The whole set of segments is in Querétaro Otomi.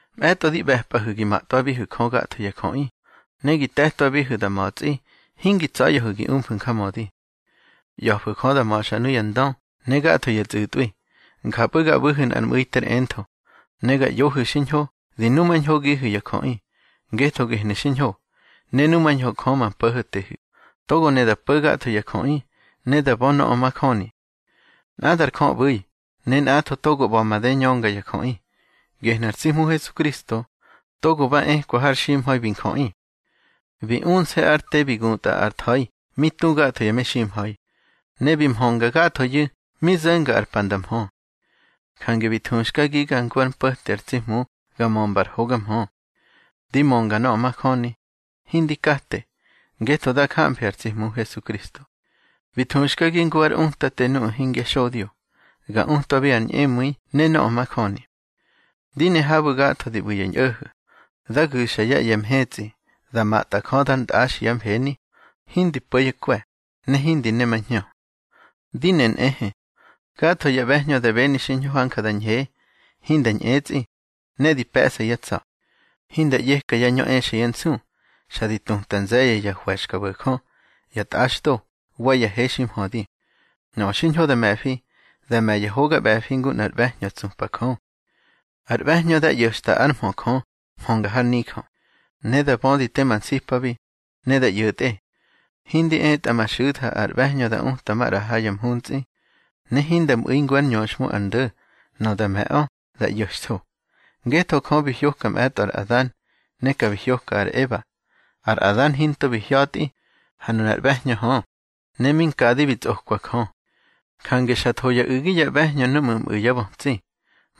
Mꞌe̱tꞌo di ꞌbe̱pꞌahu̱ gi matꞌwabihu̱ Jö gatho ya jöꞌi, ne gi te̱twabihu̱ da ma̱tsꞌi, hingi tsa̱ya̱hu̱ gi umfu̱ njamödi. ꞌYa̱fu̱ Jö da ma̱xa nuya ndö ne gatho ya tsꞌu̱tꞌwi, njapꞌu̱ ga ꞌbu̱hu̱ nꞌar mꞌu̱i ter entho, ne ga ꞌyohu̱ xiñho di numañhogihu̱ ya jöꞌi. Ngetho gehnu̱ xiñho, ne numañho Jö ma Po̱ho̱tehu̱, togo ne da mpo̱ gatho ya jöꞌi, ne da bö nöꞌö majöni. Nꞌadar Jö ꞌbu̱i, ne nꞌatho togo ꞌba̱ made ñönga ya jöꞌi. Gehnu̱ ar tsi Hmu Hesukristo, togo ba ekwa har ximha̱i bi njöꞌi. Bi unse̱ ár te bi gutꞌa ar tha̱i mi tu gatho ya meximha̱i, ne bi mhönga gathoyu̱ mi zo̱nga ar pa nda mhö. Jange bi thuxkagiga ngu ár mpo̱te ar tsi Hmu ga mömba ár hoga mhö. Di mönga nöꞌö majöni, hindi kate, ngetho dá jamfi ar tsi Hmu Hesukristo. Bi thuxkagi ngu ár utate nuꞌu̱ hingya xodyo, ga utwabi ar ñꞌemu̱i ne nöꞌö majöni. Di ne habu̱ gatho di ꞌbu̱ ya ñꞌo̱ho̱, dá gu̱xa yá ꞌye̱ mhetsꞌi, da matꞌa Jö dar ntꞌaxi yá mfeni, hindi po̱ yá kwe̱, ne hindi nemahñö. Di ne nꞌehe, gatho ya ꞌbe̱hñö da beni xiñho hanja da ñhe, hinda ñꞌetsꞌi, ne di pe̱ꞌsa yá tsa̱. Hinda ꞌyeka yá ñö exa yá nsu, xa di tuta nze̱ye̱ ya hwe̱xkabo̱jö, ya tꞌaxdo, wa ya he ximhödi. Nöꞌö xiñho da me̱fi, dá me̱ ya hoga ꞌbe̱fi ngu nꞌar ꞌbe̱hñö tsupa Jö. Ar ꞌbe̱hñö dá ꞌyo̱xta ár mhö Jö mhönga har nijö, ne da bödi tema nsipabi, ne da ꞌyo̱tꞌe. Hindi etꞌa ma xu̱tha ar ꞌbe̱hñö da uta maꞌra ha ya mhuntsꞌi, ne hinda mꞌu̱i ngu ár ñöxhmu ar ndo̱. Nöꞌö da me̱ꞌö, da ꞌyo̱xtho. Ngetho Jö bi hyoka mꞌe̱tꞌo ar Adan, ne ka bi hyoka ar Eba. Ar Adan hinto bi hya̱tꞌi, ha nunar ꞌbe̱hñö hö, ne mi nkadi bi tsꞌokwa Jö. Jange xa tho ya u̱gi ya ꞌbe̱hñö núꞌmu̱ mꞌu̱ yá bötsi.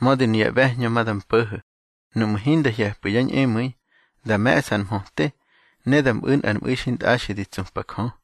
Mödi nuya ꞌbe̱hñö ma da mpo̱ho̱ nuꞌmu̱ hinda hye̱pꞌu̱ yá ñꞌemu̱i, da me̱ꞌsa ar mhöte, ne da mꞌu̱ nꞌar mꞌu̱i xintꞌaxi di tsupa Jö.